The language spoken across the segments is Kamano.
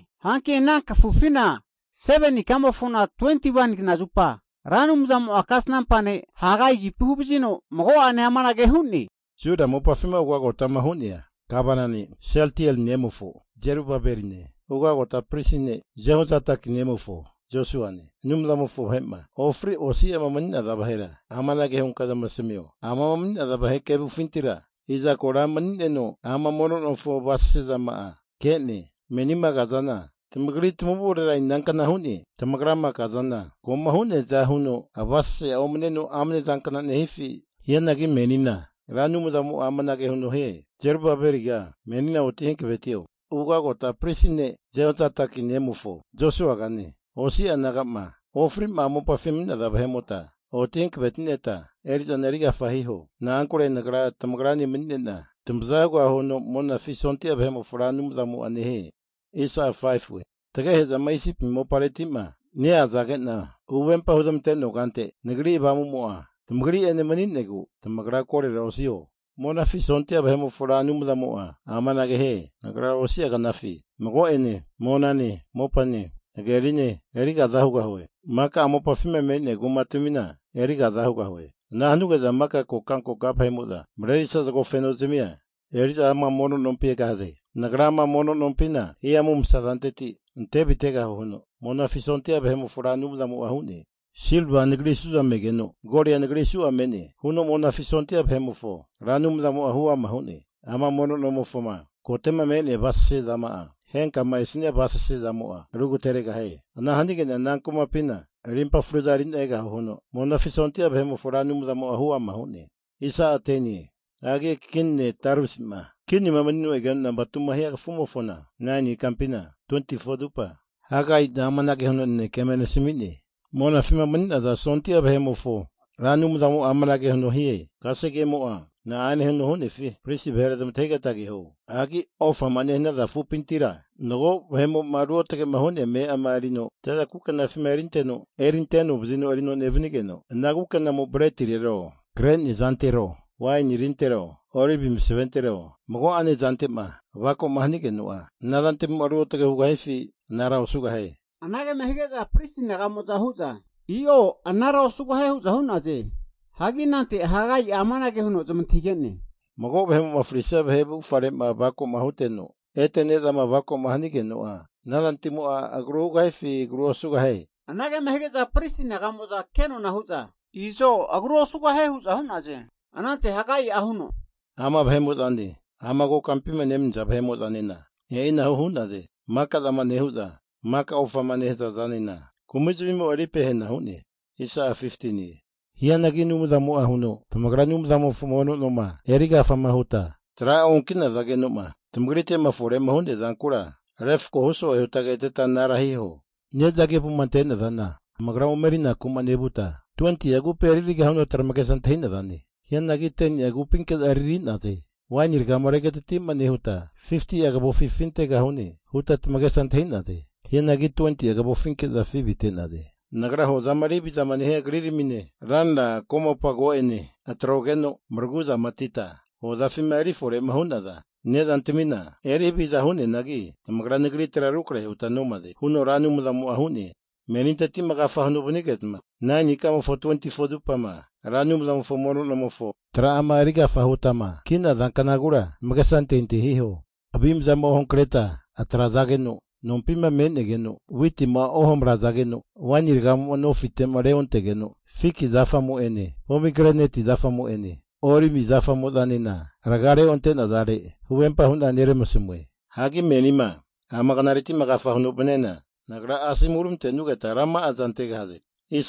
Hanki ana kafufina 7ni ikamofona 21ni knazupa Ra Anumzamo'a kasnampa ne' Hagai agipi huvazino mago'ene amanage hu'ne. Juda mopafima ugagota hu'nea Gavana ne' Sieltieli nemofo Zerubabeline, ugagota pristi ne' Jehozadaki nemofo Josuane, Anumzamofo vahe'ma ofri osi'ama mani'naza vahera amanage hunka zamasamio. Amama mani'naza vahe kevufintira iza kora mani'neno, ama mono nomofo avasase zama'a ke'ne? Menima kazana tamagri tamavurera inankna nehie? Tamagrama kazana koma hu'nea zana avasase'a omaneno amne zankna nehifi? Hianagi menina Ra Anumzamo'a amanage huno hie, Zerubabeliga menina oti hankavetio. Ugota pristi ne' Jehozadaki nemofo Josuagane, osi'a naga'ma ofri'ma ana mopafima mani'naza vahe'mota oti hanavetineta eri'zana eri agafa hiho. Na'ankure Nagra tamagrane mani'nena tamaza hugahue huno Monafi sondia vahe'mofo Ra Anumzamo'a nehie. Tamagehe'zama Isipi mopareti'ma neazage'na huvempama huzmante'noa kante, Nagri Avamu'mo'a tamagri'ene mani'negu tamagra korora osiho. Monafi sondia vahe'mofo Ra Anumzamo'a amanage nehie. Nagra osi'a knafi mago'ene monane, mopane, hagerine, eri kaza hugahue. Maka ama mopafima me'nea kumatamina eri kaza hugahue. Ana hanuge'za maka kokankoka vahe'mo'za marerisa zago feno zamia eri'za ama mono nompi egahaze. Nagra ama mono nompina hihamu masa zanteti ante avitegahue huno Monafi sondia vahe'mofo Ra Anumzamo'a hu'ne. Silva Nagri suza megeno, golia Nagri suza me'ne huno Monafi sondia vahe'mofo Ra Anumzamo'a huama hu'ne. Ama mono nomofoma kote'ma me'nea avasase zama'a, henkama esania avasase zamo'a rugateregahie. Ana hanige'na ama kumapina arimpa fruza eri'na egahue huno Monafi sondia vahe'mofo Ra Anumzamo'a huama hu'ne. Hagi kini ne' Dariusi'ma kinima manino egeno nampa 2ma hia kafumofona, 9ni ikampina 24zupa Ra Anumzamo'a mago'ene kasnampa ne' Hagaina amanage huno nanekea eme asami'ne, Monafima mani'naza sondia vahe'mofo Ra Anumzamo'a amanage huno hie. Kasegemo'a na'ane huno hu'nefi pristi vahera zamantahigeta keho. Hagi ofama nehanaza afupinti mago vahe'mo'ma ruotagema hu'nea ame'ama erino zaza kukena'afi erinte kafagino erino nevanigeno, ana kukenamo bretirero, kre ne'zantero, waini tintero olivi masaventero, mago'a ne'zante'ma avako'ma hanigeno'a, ana zantamimo'a ruotage hugahifi anara osugahie? Anagema hige'za pristi naga'mo'za hu'za, i'o anara osugahie hu'za hu'naze. Hagi anante Hagai'a amanage huno zamantahige'ne, Mago vahemo'ma fri'nesia vahe avufgare'ma avako huteno, ete ne'zama avako hanigeno'a, ana zantamimo'a agru hugahifi agrua osugahie? Anagema hige'za pristi naga'mo'za kenona hu'za, I'zo agru osugahie hu'za hu'naze. Anante Hagai'a huno, Ama vahe'mo'zane, ama kokampima nemaniza vahe'mo'zanena e'inahu hu'naze, maka'zama nehu'za, maka ofama nehaza zanena kumizmi'mo eri pehena hu'ne. Hianagi Anumzamo'a huno, Tamagra Ra Anumzamofo mono noma eri agafa huta tra'a onki'nazageno'ma tamagrite'ma fore'ma hu'nea zankura, refkohu so'e huta keteta anara hiho. Ne'za kevuma ante'nazana tamagra ome erinaku'ma nevuta, 20'a kupi eririgahune huta tamagesa antahi'naze. Hianagi 10ni'a kupinke'za eriri'naze. Waini ragama regatati'ma nehuta 50'a kavofi afi avitegahune huta tamagesa antahi'naze. Hianagi 20'a kavofinke'za afi avite'naze. Nagra hozama eri havizama nehia kriramine, ranra komopa ko'ene atrogeno maraguzamatita hozafima eri fore'ma hu'naza ne'zantamina eri haviza hu'neanagi, tamagra Nagritera rukrahera huta nomaze, huno Ra Anumzamo'a hu'ne. Meninteti'ma agafa huno vanigeta, 9ni ikamofo 24zupama Ra Anumzamofo mono nomofo tra'ama eri agafama huta ki'naza knagura tamagesa antahintahi hiho. Avimzama ohankreta atrazageno nompima menegeno, witima ohamarazageno, waini ragamo'ma nofitema reontegeno, fiki zafamo'ene pomigreneti zafamo'ene olivi zafamo'zanena raga reonte'nazare huvempa hu'na neramasamue. Hagi menima ama knareti'ma agafama huno vaniana, Nagra asomu huramantenugeta rama'aza antegahaze.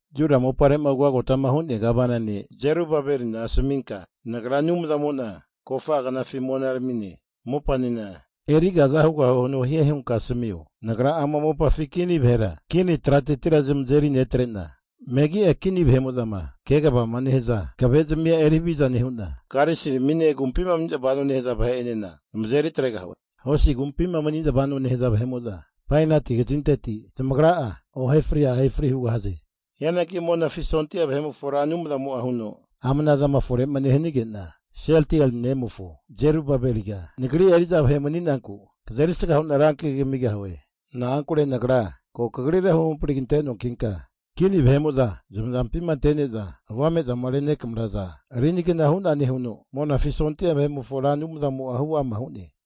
Juda mopare'ma ugotama hu'nea Gavana ne' Zerubabelina asaminka, Nagra Anumzamo'na kofa'a knafi monaramine mopanena eri kaza hugahue huno hie hunka asamio. Nagra ama mopafi kini vahera kini tratetira zamazeri netre'na, megi'a kini vahe'mo'zama kegavama nehaza hankavezmia eri haviza nehu'na, karisiramine agumpima mani'za vanoma nehaza vahe'enena zamazeri atregahue. Hosi agumpima mani'za vanoma nehaza vahe'mo'za bainati kazinteti zamagra'a ohefri ahefri hugahaze. Hianagi Monafi sondia vahe'mofo Ra Anumzamo'a huno, ama ana zama fore'ma nehanige'na Sieltieli nemofo Zerubabeliga, Nagri eri'za vahe mani'nanku kazerisga hu'na rankagi kamigahue. Na'ankure Nagra ko kagrira huhampri kante noankinka, kini vahe'mo'zama zamazampima ante'neza avame'zama renekamaraza rinigna hu'nane huno Monafi sondia vahe'mofo Ra Anumzamo'a huama hu'ne.